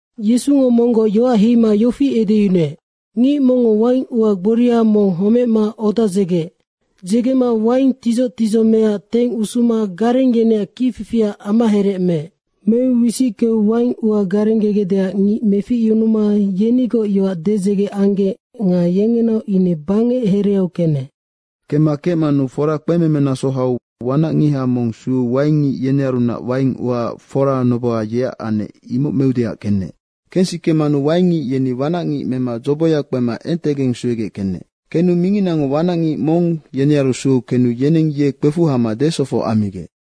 Yesungo monggoc yoac heima yofi edeyunuec, “Ngic mongngo waing ua gboria mong homecma oda dzegeec. Dzegema waing tidzac tidzameac teng usuma gareng yeneac kicfifiac amaherec meec. Meu wisickeu waing ua garenggegecdeac ngic meficyunuma yenigoc yoac dedzege anggec nga yengenaoc ine bangec hereau kenec. Kemma kecmanu fora kpememe naso hau wanacngiha mong sueu waingngic yenearunac waing uaac fora noboha yeac anec, imoc meudeac kenec. Kensikemanu waingngic yeni wanacngic mema dzoboya kpema entegeng suegec kenec. Kenu minginango wanacngic mong yenearu sueu kenu yeneng ye kpefuhama desofoc ammigec.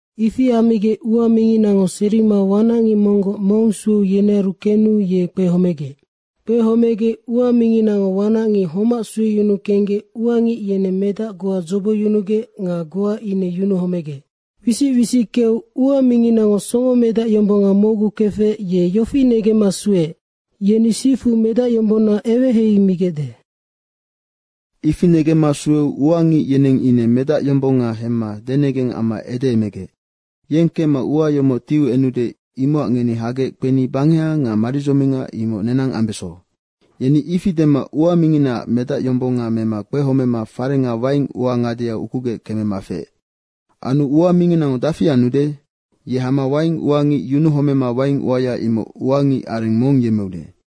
Ifi ammigec ua minginango serima wanacngic monggoc mong sueu yenearu kenu ye kpehomegec. Kpehomegec ua minginango wanacngic homac sueyunuu kenggec ua ngic yeneng medac goa dzoboyunugec nga goa ine yunuhomegec. Wisic wisickeau ua minginango songomedacyombonga mocgu kefec, ye yofi negemma sueec, ‘Yeni sifu medacyombonna eweheimigecde.’ Ifi negemma sueu ua ngic yeneng ine medacyombonga hemma denegeng amma edeemegec, ‘Yeng kecma ua yomoc tiu enude, imocac ngeni hagec kpeni bangeha nga maridzominga imoc nenang ambeso.’ Yeni ifi dema ua minginaac medacyombonga mema kpehomema farenga waing ua ngadeau ukugec kemema feec. Anu ua minginango dafi anude? Ye hama waing ua ngic yunuhomema waing uaya imoc ua ngic areng mong yemmeude.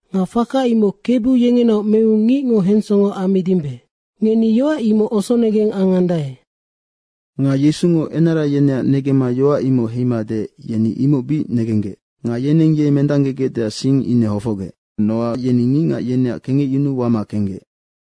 Nga faka imoc Kebu yengenaoc meu ngicngo hensongo ammidimbe.’ Ngeni yoac imoc osonegeng angandae.” Nga Yesungo enara yeneac negemma yoac imoc heima deec, yeni imoc bic negenggec. Nga yeneng ye mendanggegecdeac sing ine hofocgec. Nocac yeni ngicngac yeneac kengecyunuu wama kenggec.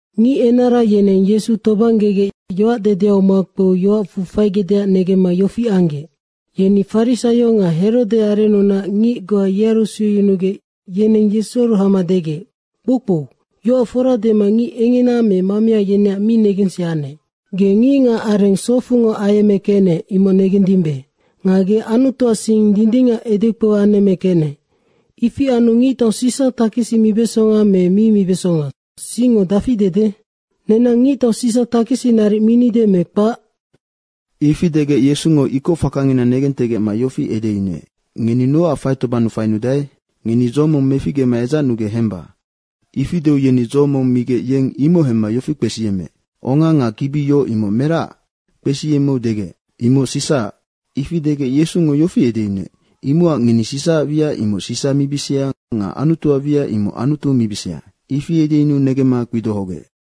Ngicenara yeneng Yesu tobanggegec yoacdedeau makpeu yoacfu faigecdeac negemma yofi anggec. Yeni farisaio nga Herodeac arennunac ngic goa yearu sueyunugec yeneng Yesuaru hama degec, “Kpoukpou, yoac fora dema ngic engena me mamea yeneac mi negensiannec. Ge ngicngac areng socfungoc ayemmekecnec, imoc negendimbe. Nga ge Anutuac sing dindingac edekpou anemmekecnec. Ifi anu ngictau Sisa takesi mibesonga me mi mibesonga, singngo dafi dede? Nenang ngictau Sisa takesi naric minide me kpac?” Ifi degec Yesungo ikocfakangina negentegecma yofi edeyunuec, “Ngeni nocac faitobannu fainudae? Ngeni dzo mong meficgema edzacnugec hemba.” Ifi deu yeni dzo mong migec yeng imoc hemma yofi kpesiyemmeec, “Onga nga kibi yoc, imoc meracac?” kpesiyemmeu degec, “Imoc Sisaac.” Ifi degec Yesungo yofi edeyunuec, “Imocac ngeni Sisaac wiac, imoc Sisa mibisia nga Anutuac wiac, imoc Anutu mibisia!” Ifi edeyunuu negemma kpidohogec.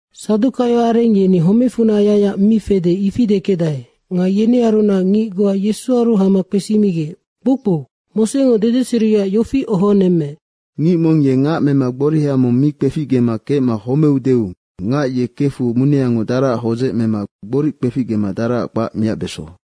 Sadukaio areng yeni homecfunac yacyac mi fede, ifi dekecdae. Nga yenearunac ngic goa Yesuaru hama kpesimigec, “Kpoukpou, Mosengo dedeseriyoac yofi ohonemmeec, ‘Ngic mong ye ngac mema gboriha mong mi kpeficge kecma homeudeu ngac ye kefu muneango daraac hodzec mema gboric kpeficgema daraac kpac miacbeso.’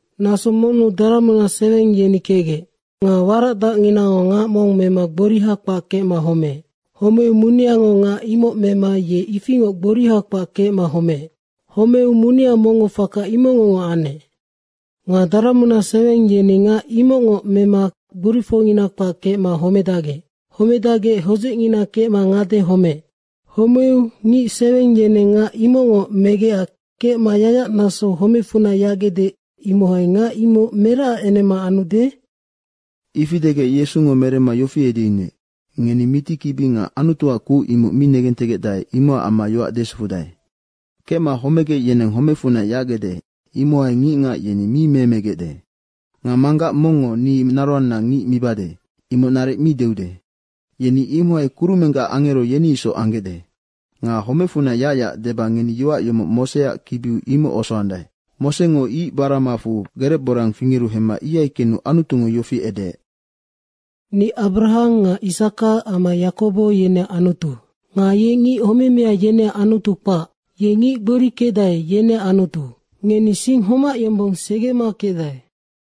Naso monnu daramuna seweng yeni kecgec. Nga waracdacnginango ngac mong mema gboriha kpac kecma homeec. Homeu muneango ngac imoc mema ye ifingoc gboriha kpac kecma homeec. Homeu munea mongngo faka imocngoc anec. Nga daramuna seweng yeni ngac imocngoc mema gboricfocngina kpac kecma homedacgec. Homedacgec hodzecngina kecma ngade homeec. Homeu ngic seweng yeneng ngac imocngoc megecac kecma yacyac nasou homecfunac yacgecde, imohai ngac imoc meracac enema anude?” Ifi degec Yesungo meremma yofi edeyunuec, “Ngeni mitikibi nga Anutuac kuc, imoc mi negentegecdae, imocac amma yoac desufudae. Kecma homegec yeneng homecfunac yacgecde, imohai ngicngac yeni mi meemegecde. Nga manggac mongngo ‘Ni naroanna ngic mibade.’ imoc naric mi deude. Yeni imohai kurumenggac angero, yeni isoc anggecde. Nga homecfunac yacyac deba, ngeni yoac yomoc Moseac kibiu imoc osoandae, Mosengo icfu gerecborang fingeru hemma ihai kenu Anutungo yofi edeec, ‘Ni Abrahang nga Isaka amma Yakobo, yeneac Anutu.’ Nga ye ngic homemea yeneac Anutu kpac. Ye ngic gbori kecdae, yeneac Anutu. Ngeni sing homac yombong segema kecdae.”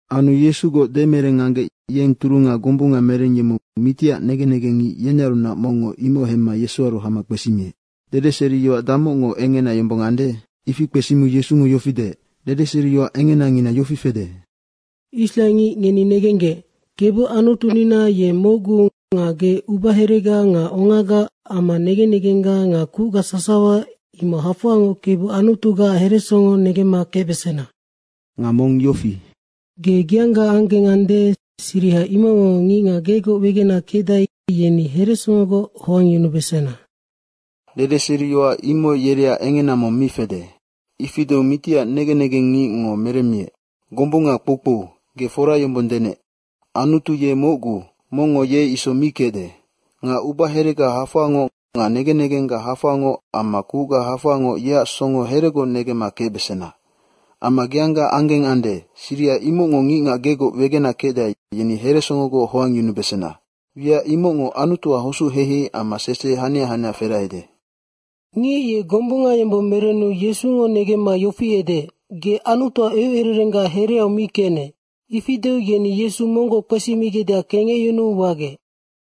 Anu Yesugoc demereng anggec, yeng turunga gombunga merengyemmeu mitiac negen negengngic yenearunac mongngo imoc hemma Yesuaru hama kpesimiec, “Dedeseriyoac damocngo engena yombong ande?” Ifi kpesimiu Yesungo yofi deec, “Dedeseriyoac engenangina yofi fede, ‘Israengic ngeni negenggec, Kebu Anutunina ye mocgu nga ge ubaherega nga ongaga amma negen negengga nga kucga sasawa, imoc hafoangoc Kebu Anutugaac heresongo negemma kecbesena.’ Nga mong yofi, ‘Ge geangga anggengande, siriha imocngoc ngicngac gegoc wegena kecdae, yeni heresongogoc hoangyunubesena.’ Dedeseriyoac imoc yereac engena mong mi fede.” Ifi deu mitiac negen negengngicngo meremmiec, “Gombunga kpoukpou, ge fora yombong denec. Anutu ye mocgu, mongngo ye isoc mi kecde. Nga ubaherega hafoangoc nga negen negengga hafoangoc amma kucga hafoangoc yeac songo heregoc negemma kecbesena amma geangga anggengande, siriha imocngoc ngicngac gegoc wegena kecdae, yeni heresongogoc hoangyunubesena, wiac imocngonoc Anutuac hosuc heihei amma sese hania hania ferahade.” Ngic ye gombunga yombong merenu Yesungo negemma yofi edeec, “Ge Anutuac eucererenggac hereau mi kecnec.” Ifi deu yeni Yesu monggoc kpesimigecdeac kengecyunuu wagec.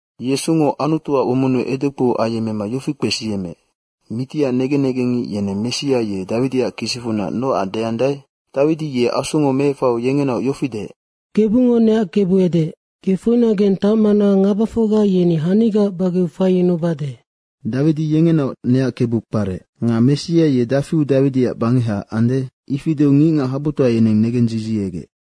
Yesungo Anutuac womonnu edekpou ayemmema yofi kpesiyemmeec, “Mitiac negen negengngic yeneng Messia ye Dawidiac kisicfunac nocac deandae?” Dawidi ye Asungo meefaiu yengenaoc yofi deec, “KEBUNGO neac Kebu edeec, ‘Ge foinaugeng tacmana ngabafocga yeni hanigaac bageu faiyunubade.’ Dawidi yengenaoc ‘Neac Kebu’, kparec. Nga Messia ye dafiu Dawidiac bangeha ande?” Ifi deu ngicngac habutoa yeneng negendzidziegec.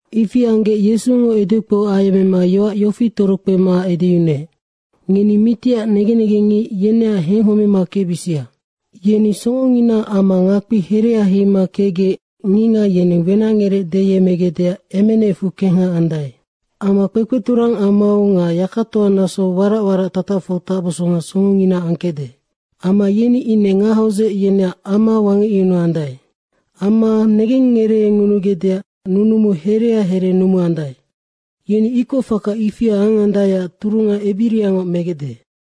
Ifi anggec Yesungo edekpou ayemmema yoac yofi torokpema edeyunuec, “Ngeni mitiac negen negengngic yeneac henghomema kecbisia. Yeni songonginaac amma ngakpi herea heima kecgec ngicngac yeneng wenacngerec deyemmegecdeac emenecfu kenghaandae. Amma kpekpeturang amau nga yakatoa nasou warac warac tatacfu tacbesonga songongina angkecde. Amma yeni ine ngachodzec yeneac ama wangecyunuandae. Amma negen ngereengunugecdeac nunumu herea here numuandae. Yeni ikocfaka ifia angandaeac turunga ebiriangoc megecde.”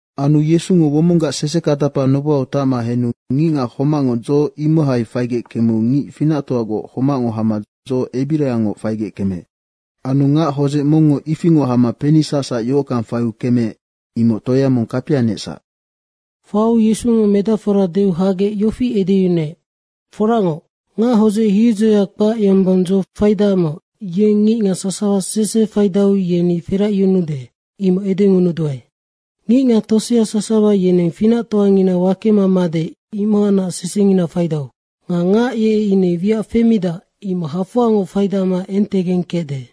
Anu Yesungo womonggac sesekatapa nobohau tacma henu ngicngac homacngo dzo imohai faigec kemeu ngic finactoagoc homacngo hama dzo ebiriangoc faigec kemeec. Anu ngac hodzec mongngo ifingoc hama peni sacsac yohockang faiu kemeec, imoc toea mong kapianecsac. Faiu Yesungo medacfora deu hagec yofi edeyunuec, “Foracngoc, ngac hodzec hiedzoya kpac yombong dzo faidacmoc, yeng ngicngac sasawa sese faidau, yeni feracyunude, imoc edengunuduae. Ngicngac tosea sasawa, yeneng finactoangina wakema made, imohacnac sesengina faidau. Nga ngac ye ine wiac femidac, imocnoc hafoangoc faidacma entegeng kecde.”